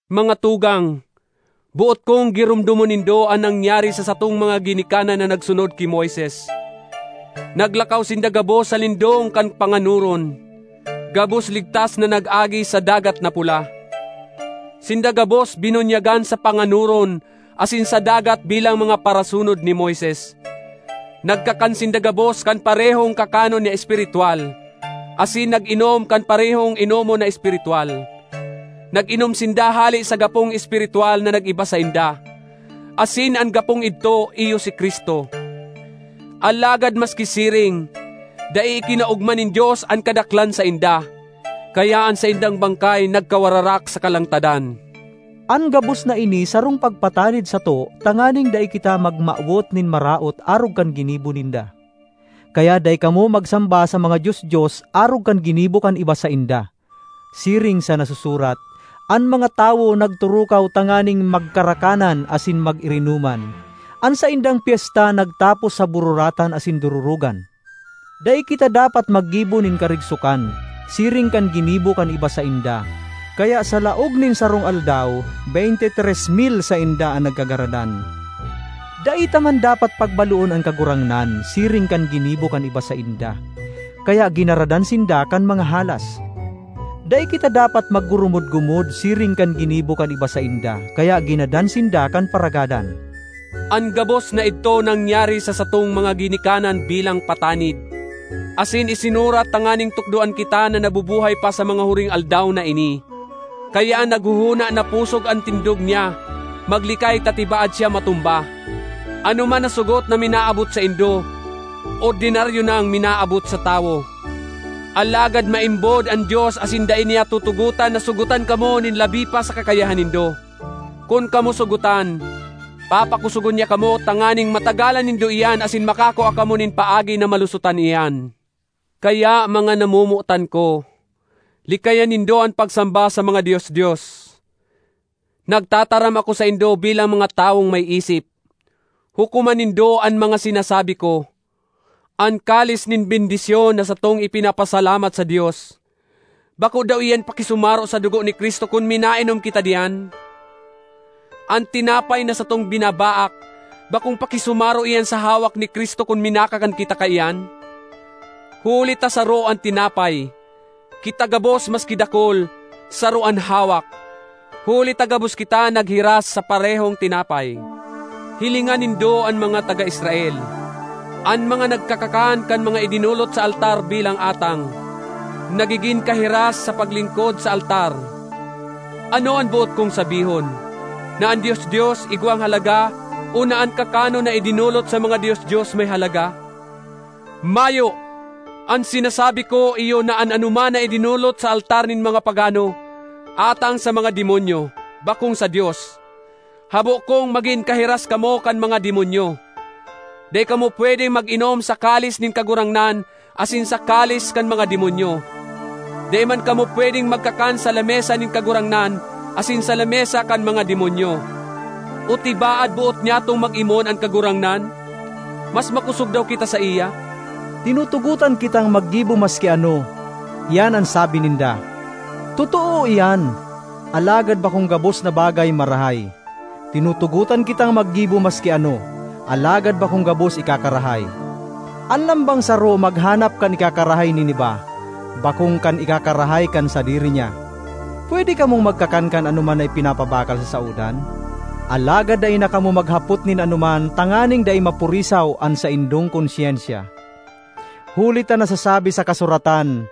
Mga tugang, boot kong giromdomon nindo an nangyari sa satong mga ginikanan na nagsunod ki Moises. Naglakaw sinda gabos sa lindong kan panganoron; gabos ligtas na nag-agi sa Dagat na Pula. Sinda gabos binunyagan sa panganoron asin sa dagat bilang mga parasunod ni Moises. Nagkakan sinda gabos kan parehong kakanon na espiritwal, asin nag-inom kan parehong inomon na espiritwal. Nag-inom sinda hale sa Gapong espiritwal na nag-iba sainda, asin an Gapong idto iyo si Cristo. Alagad maski siring, dai ikinaogma nin Dios an kadaklan sainda, kaya an saindang bangkay nagkawararak sa kalangtadan. An gabos na ini sarong pagpatanid sato tanganing dai kita magmawot nin maraot arog kan ginibo ninda. Kaya dai kamo magsamba sa mga dios-dios, arog kan ginibo kan iba sainda, siring sa nasusurat, “An mga tawo nagturukaw tanganing magkarakanan asin mag-irinoman; an saindang pyesta nagtapos sa bururatan asin dororogan.” Dai kita dapat maggibo nin karigsokan, siring kan ginibo kan iba sainda, kaya sa laog nin sarong aldaw, beynte tres mil sainda an nagkagaradan. Dai ta man dapat pagbaloon an Kagurangnan, siring kan ginibo kan iba sainda, kaya ginaradan sinda kan mga halas. Dai kita dapat maggurumod-gumod, siring kan ginibo kan iba sainda, kaya ginadan sinda kan Paragadan. An gabos na idto nangyari sa satong mga ginikanan bilang patanid, asin isinurat tanganing tukdoan kita na nabubuhay pa sa mga huring aldaw na ini. Kaya an naghohona na pusog an tindog niya, maglikay ta tibaad siya matumba. Anoman na sogot na minaabot saindo, ordinaryo nang minaabot sa tawo. Alagad maimbod an Dios asin dai niya tutugotan na sogotan kamo nin labi pa sa kakayahan nindo. Kun kamo sogotan, papakosogon niya kamo tanganing matagalan nindo iyan asin makakua kamo nin paagi na malusotan iyan. Kaya, mga namomotan ko, likayan nindo an pagsamba sa mga dios-dios. Nagtataram ako saindo bilang mga tawong may isip; hukoman nindo an mga sinasabi ko. An kalis nin bendisyon na satong ipinapasalamat sa Dios, bako daw iyan pakisumaro sa dugo ni Cristo kun minainom kita diyan? An tinapay na satong binabaak, bakong pakisumaro iyan sa hawak ni Cristo kun minakakan kita kaiyan? Huli ta saro an tinapay, kita gabos maski dakul, saro an hawak, huli ta gabos kita naghiras sa parehong tinapay. Hilinga nindo an mga taga Israel; an mga nagkakakan kan mga idinolot sa altar bilang atang, nagigin kahiras sa paglingkod sa altar. Ano an boot kong sabihon? Na an dios-dios igwang halaga o na an kakanon na idinolot sa mga dios-dios may halaga? Mayo! An sinasabi ko iyo na an anoman na idinolot sa altar nin mga pagano, atang sa mga demonyo, bakong sa Dios. Habo kong magin kahiras kamo kan mga demonyo. Dai kamo pwedeng mag-inom sa kalis nin Kagurangnan asin sa kalis kan mga demonyo; dai man kamo pwedeng magkakan sa lamesa nin Kagurangnan asin sa lamesa kan mga demonyo. O tibaad boot nyatong mag-imon an Kagurangnan? Mas makosog daw kita saiya? ”Tinutugotan kitang maggibo maski ano,” iyan an sabi ninda. Totoo iyan, alagad bakong gabos na bagay marahay. “Tinutugotan kitang maggibo maski ano,” alagad bakong gabos ikakarahay. An lambang saro maghanap kan ikakarahay nin iba, bakong kan ikakarahay kan sadiri niya. Pwede kamong magkakan kan anoman na ipinagpapabakal sa saodan, alagad dai na kamo maghapot nin anoman tanganing dai mapurisaw an saindong konsyensya. Huli ta nasasabi sa kasuratan,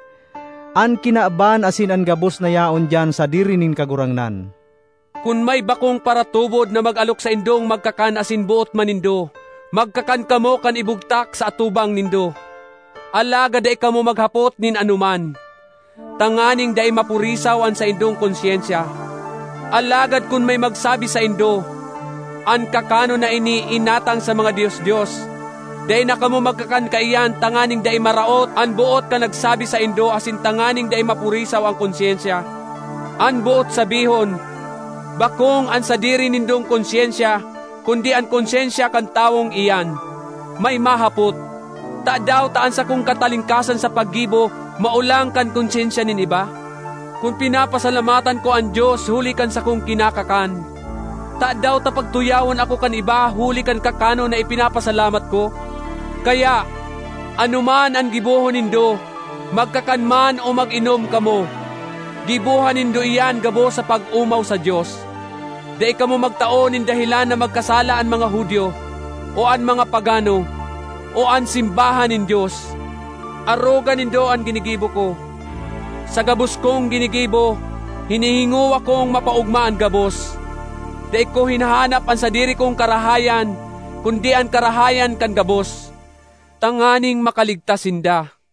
“An kinaban asin an gabos na yaon diyan sadiri nin Kagurangnan.” Kun may bakong paratubod na mag-alok saindong magkakan asin boot man nindo, magkakan kamo kan ibugtak sa atubang nindo, alagad dai kamo maghapot nin anoman, tanganing dai mapurisaw an saindong konsyensya. Alagad kun may magsabi saindo, “An kakanon na ini inatang sa mga dios-dios,” dai na kamo magkakan kaiyan tanganing dai maraot an boot kan nagsabi saindo asin tanganing dai mapurisaw an konsyensya— an boot sabihon, bakong an sadiri nindong konsyensya, kundi an konsyensya kan tawong iyan. May mahapot, “Tadaw ta an sakong katalingkasan sa paggibo maolang kan konsyensya nin iba? Kun pinapasalamatan ko an Dios huli kan sakong kinakakan, tadaw ta pagtuyawon ako kan iba huli kan kakanon na ipinapasalamat ko?” Kaya, anoman an gibohon nindo, magkakan man o mag-inom kamo, giboha nindo iyan gabos sa pag-omaw sa Dios. Dai kamo magtao nin dahelan na magkasala an mga Judio, o an mga pagano, o an simbahan nin Dios. Aroga nindo an ginigibo ko: sa gabos kong ginigibo, hinihingowa kong mapaogma an gabos; dai ko hinahanap an sadiri kong karahayan kundi an karahayan kan gabos, tanganing makaligtas sinda.